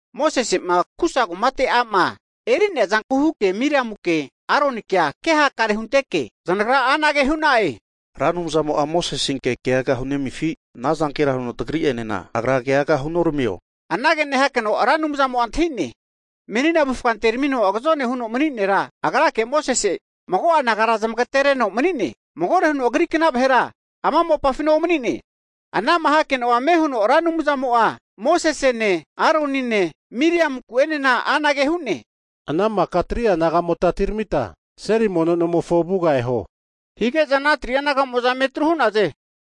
Mosese'ma Kusa (Itiopia) kumate a'ma eri'nea zanku huke Miriamuke, Aronikea kehakare hunteke, zanagra anage hu'na'e, Ra Anumzamo'a Mosesenke kegaga hunemifi? Anazankera huno tagri'enena Agra kea huoramigahio? Anage nehakeno Ra Anumzamo antahi'ne. Mosese'a menina avufga antermino agazone huno mani nera mago'a nagara zamagatereno agrake mani'ne. Magore huno agri kna vahera ama mopafina omani'ne. Ana'ma hakeno'a ame huno Ra Anumzamo'a Mosesene, Aronine, Miriamunku'enena anage hu'ne, ana maka 3'a nagamota atiramita seli mono nomofo avuga eho. Hige'za ana 3'a naga'mo'za eme atru hu'naze.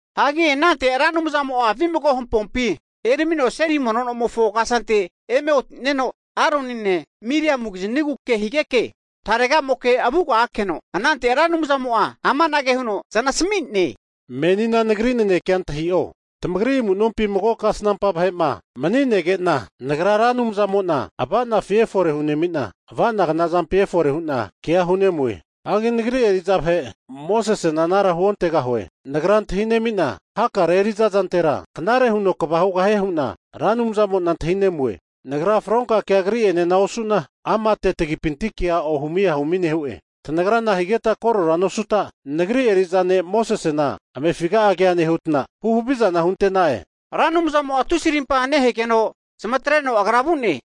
Hagi anante Ra Anumzamo'a vimago hampompi eramino seli mono nomofo kasante eme otineno, Aronine, Miriamu kiznigu ke higeke tarega'moke avuga akeno, anante Ra Anumzamo'a amanage huno zanasmi'ne, Menina Nagri nanekea antahi'o. Tamagri amu'nompi mago kasnampa vahe'ma mani'negena Nagra Ra Anumzamo'na ava'nafi efore hunemina, avanagna zampi efore hu'na kea hunemue. Hagi Nagri eri'za vahe Mosesena anara huontegahue. Nagra antahi nemina hakare eri'za zantera knare huno kva hugahie hu'na Ra Anumzamo'na antahinemue. Nagra fronka kea agri'enena osu'na, amate tagipinti kea ohumi ahumi nehu'e. Tanagra nahigeta korora nosuta, Nagri eri'za ne' Mosesena amefiga'a kea nehuta, hu havizana hunenta'e? Ra Anumzamo'a tusi rimpa nehegeno zamatreno Agra vu'ne.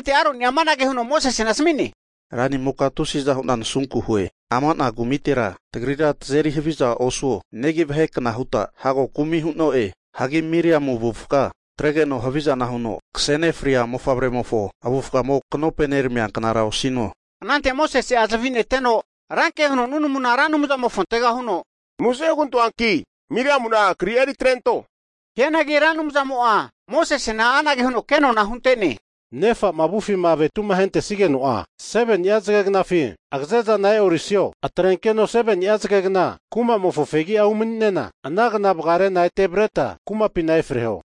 Anante Aroni amanage huno Mosesena asmi'ne, ranimoke tusiza hu'na nasunku hue, ama'na kumitera tagrira tazeri haviza osuo, negi vahe kna huta hago kumi hu'no'e. Hagi Miriamu avufga atregeno haviza huno, kase nefria mofavremofo avufgamo knopeneramia knara osino. Anante Mosese'a zavi neteno ranke huno nunamuna Ra Anumzamofontega huno, muse hugantoanki Miriamuna kri'a eri atrento. Hianagi Ra Anumzamo'a Mosesena anage huno ke nona'a hunte'ne, Nefa'ma avufima avetu ahentesigeno'a, 7ni'a zage gnafina agaze zana e'orisio? Atrenkeno 7ni'a zage gna kumamofo fegi'a umani'nena, ana kna vagarena ete avreta kumapina efreho.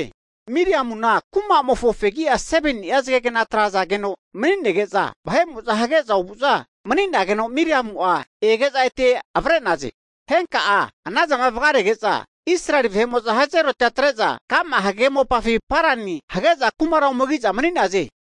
Miriamuna kumamofo fegu'a 7ni'a zagegna atrazageno mani'nege'za, hage'za ovuza mani'nageno Miriamu'a ege'za ete avre'naze. Henka'a, anazama vagarege'za, Israeli vahe'mo'za Hazeroti'a atre'za ka'ma hagage mopafi Parani hage'za kumara ome ki'za mani'naze.